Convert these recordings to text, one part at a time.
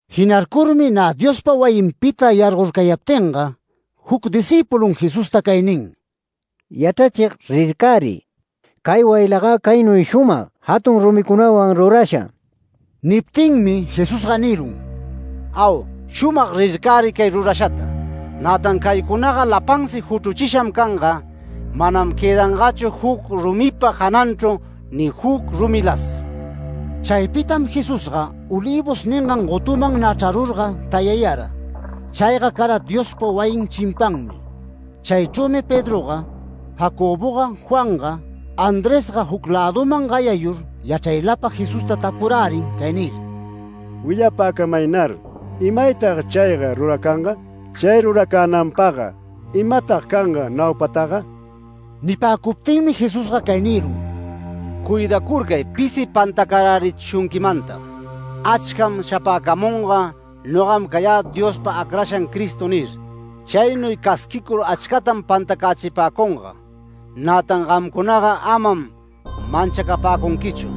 Jinarcurmi nä Diospa wayinpita yargorcayaptinga juc discïpulun Jesusta cay nin: “Yachrachig rircäriy, ¡cay wayilagä caynuy shumag, jatun rumicunawan rurasha!” Niptinmi Jesusga nirun: “Au, shumag rircäriy cay rurashata. Nätan caycunaga lapansi juchruchisham canga, manam quëdangachu juc rumipa jananchru ni juc rumilas”. Chaypitam Jesusga Olivos ningan gotuman nä chrarurga tayayara. Chayga cara Diospa wayin chimpanmi. Chaychrümi Pedroga, Jacoboga, Juanga, Andresga juc läduman gayayur yachraylapa Jesusta tapurärin cay nir: “Willapäcamaynar. ¿Imaytag chayga ruracanga? Chay ruracänanpagga ¿imatag canga naupataga?” Nipäcuptinmi Jesusga cay nirun: “Cuidacurcay pisi pantacarärichishunquimantag. Achcam shapäcamunga ‘Nogam cayä Diospa acrashan Cristo’ nir. Chaynuy casquicur achcatam pantacächipäcunga. Nätan gamcunaga amam manchacapäcunquichu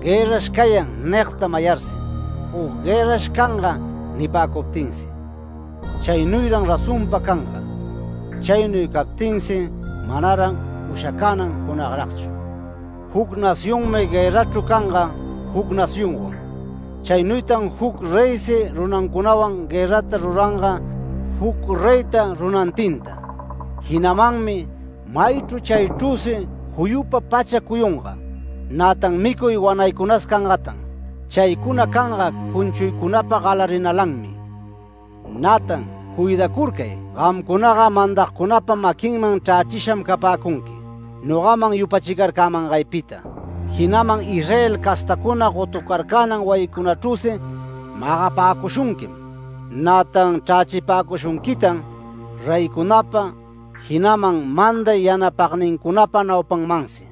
‘Guërrash cayan’ nigta mayarsi, u ‘Guërrash canga’ nipäcuptinsi. Chaynuyran razonpa canga. Chaynuy captinsi manaran ushacanan junagragchu. Juc nacionmi guërrachru canga juc nacionwan. Chaynuytan juc reysi runancunawan guërrata ruranga juc reyta runantinta. Jinamanmi maychru chaychrüsi juyupa pacha cuyunga. Nätan micuy wanaycunas cangatan. Chaycuna canga cunchuycunapa galarinalanmi. Nätan cuidacurcay, gamcunaga mandagcunapa maquinman chrächisham capäcunqui, nogaman yupachicurcangaypita. Jinaman Israel castacuna gotucarcänan wayicunachrüsi magapäcushunquim, nätan chrächipäcushunquitan reycunapa, jinaman manday yanapagnincunapa naupanmansi.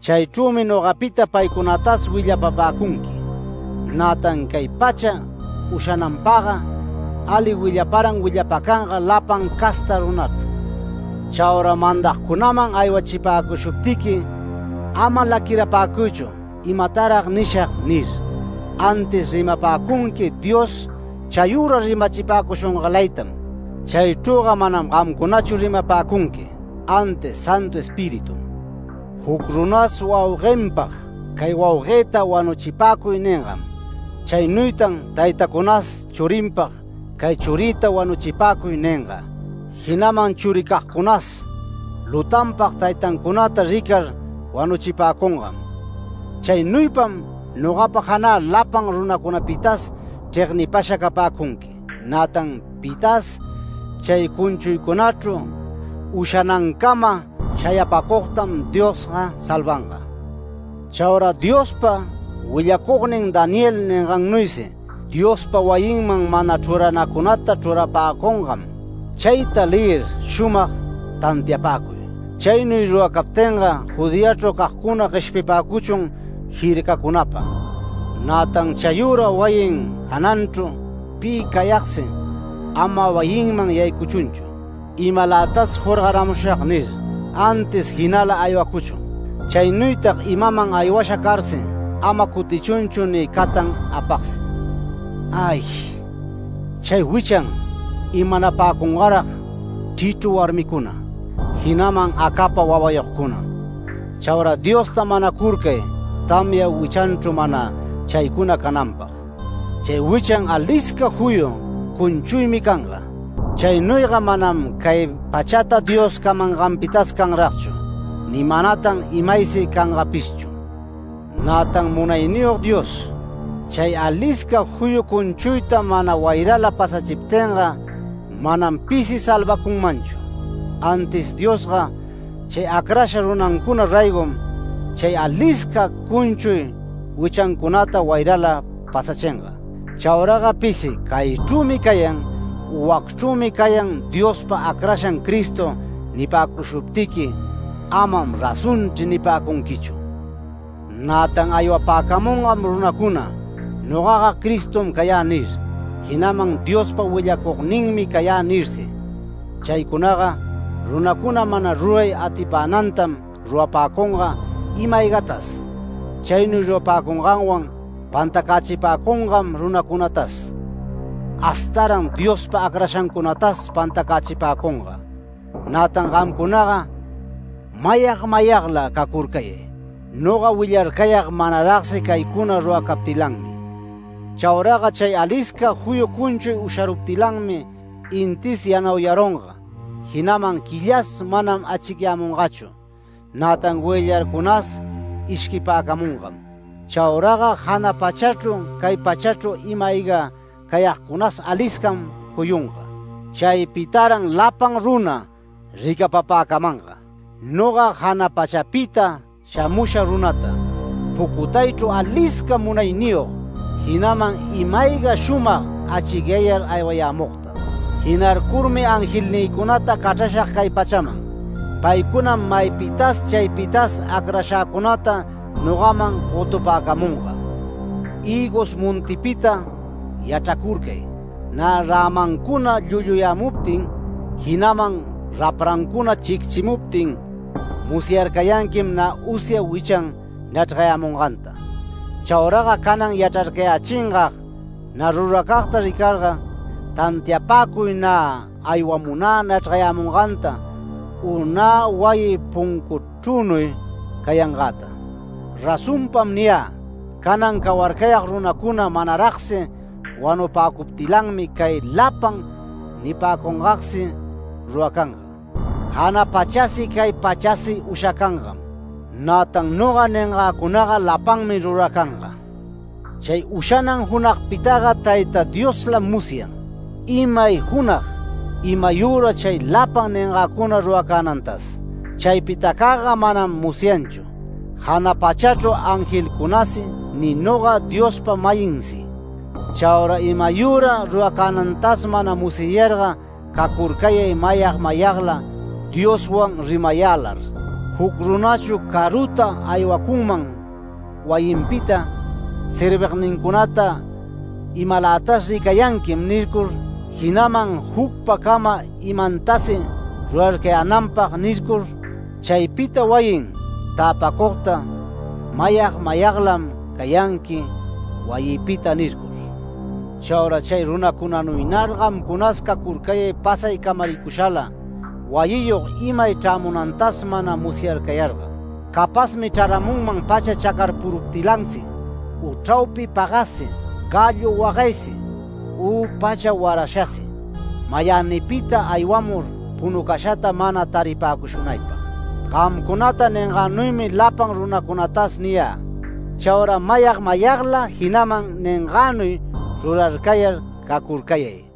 Chaychrümi nogapita ali paycunatas willapapäcunqui. Nätan cay pacha ushananpagga ali willaparan willapacanga lapan casta runachru. Chaura mandagcunaman aywachipäcushuptiqui, ama laquirapäcuychu ‘¿Imatarag nishag?’ nir, antis rimapäcunqui Dios chayüra rimachipäcushungalaytam. Chaychrüga manam gamcunachu rimapäcunqui, antis Santu Espiritum. Juc runas wauguenpag ‘Cay wauguëta wanuchipäcuy’ ningam. Chaynuytan taytacunas churinpag ‘Cay churïta wanuchipäcuy’ ninga. Jinaman churicagcunas lutanpag taytancunata ricar wanuchipäcungam. Chaynuypam nogapa janä lapan runacunapitas chregnipasha capäcunqui, nätan pitas chay cunchuycunachru ushanancama shayapäcugtam Diosga salvanga. Chaura Diospa willacugnin Daniel ningannuysi, Diospa wayinman mana chruranancunata chrurapäcungam. Chayta leyir shumag tantiapäcuy. Chaynuy ruracaptinga Judeachru cagcuna gueshpipäcuchun jircacunapa. Nätan chayüra wayin jananchru pi cayagsi, ama wayinman yaycuchunchu ‘Imalätas jorgaramushag’ nir, antis jinala aywacuchun. Chaynuytag imaman aywasha carsi, ama cutichunchu ni catan apagsi. ¡Ay! chay wichan imanapäcungarag chrichru warmicuna, jinaman acapa wawayogcuna. Chaura Diosta manacurcay tamya wichanchru mana chaycuna cananpag. Chay wichan alisca juyu cunchuymi canga. Chaynuyga manam cay pachata Dios camanganpitas canragchu, ni manatan imaysi cangapishchu. Nätan Munayniyog Dios, chay alisca juyu cunchuyta mana wayrala pasachiptinga manam pisi salvacunmanchu. Antis Diosga chay acrasha runancuna raygom, chay alisca cunchuy wichancunata wayrala pasachinga. Chauraga pisi ‘Caychrümi cayan’ u ‘Wacchrümi cayan Diospa acrashan Cristo’ nipäcushuptiqui ‘Amam razonchri’ nipäcunquichu. Nätan aywapäcamungam runacuna ‘Nogaga Cristom cayä’ nir, jinaman ‘Diospa willacugninmi cayä’ nirsi, chaycunaga runacuna mana ruray atipänantam rurapäcunga ima-aygatas. Chaynuy rurapäcunganwan pantacächipäcungam runacunatas, hastaran Diospa acrashancunatas pantacächipäcunga. Nätan gamcunaga mayag mayagla cacurcayay. Noga willarcayag manaragsi chaycuna ruracaptilanmi”. “Chauraga chay alisca juyu cunchuy usharuptilanmi intis yanauyarunga, jinaman quillasi manam achicyämungachu. Nätan goyllarcunas ishquipäcamungam. Chauraga jana pachachru cay pachachru ima-ayga cayagcunas aliscam cuyunga. Chaypitaran lapan runa ricapapäcamanga, noga jana pachapita shamusha runata pucutaychru alisca munayniyog, jinaman ima-ayga shumag achicyayar aywayämugta. Jinarcurmi angelnïcunata cachrashag cay pachaman. Paycunam maypitas chaypitas acrashäcunata nogaman gotupäcamunga. Hïgos montipita yachracurcay. Nä rämancuna llulluyämuptin jinaman raprancuna chicchimuptin, musyarcayanquim nä usya wichan nachrgayämunganta. Chauraga canan yachrarcayächingag nä ruracagta ricarga, tantiapäcuy nä aywamunä nachrgayämunganta u nä wayï puncuchrünuy cayangäta. Razonpam niyä: Canan cawarcayag runacuna manaragsi wanupäcuptilanmi cay lapan nipäcungagsi ruracanga. Jana pachasi cay pachasi ushacangam, nätan noga ningäcunaga lapanmi ruracanga. Chay ushanan junagpitaga Tayta Dioslam musyan, imay junag, imayüra chay lapan ningäcuna ruracänantas. Chaypitacagga manam musyanchu, jana pachachru angelcunasi ni noga, Diospa-mayinsi. Chaura imayüra ruracänantas mana musyayarga cacurcayay mayag mayagla Dioswan rimayälar. Juc runachu caruta aywacunman wayinpita, servignincunata ‘Imalätas ricayanquim’ nircur, jinaman ‘Jucpacama imantasi rurarcayänanpag’ nircur. Chaypita wayin täpacugta ‘Mayag mayaglam cayanqui wayïpita’ nircur. Chaura chay runacunanuynar gamcunas cacurcayay pasay camaricushala, wayiyog imay chrämunantas mana musyarcayarga. Capazmi chraramunman pacha chacarpuruptilansi, u chraupi pagassi, gallo wagaysi, u pacha warashasi. Mayänipita aywamur punucashata mana taripäcushunaypag. Gamcunata ningänuymi lapan runacunatas niyä: Chaura mayag mayagla jinaman ningänuy rurarcayar cacurcayay”.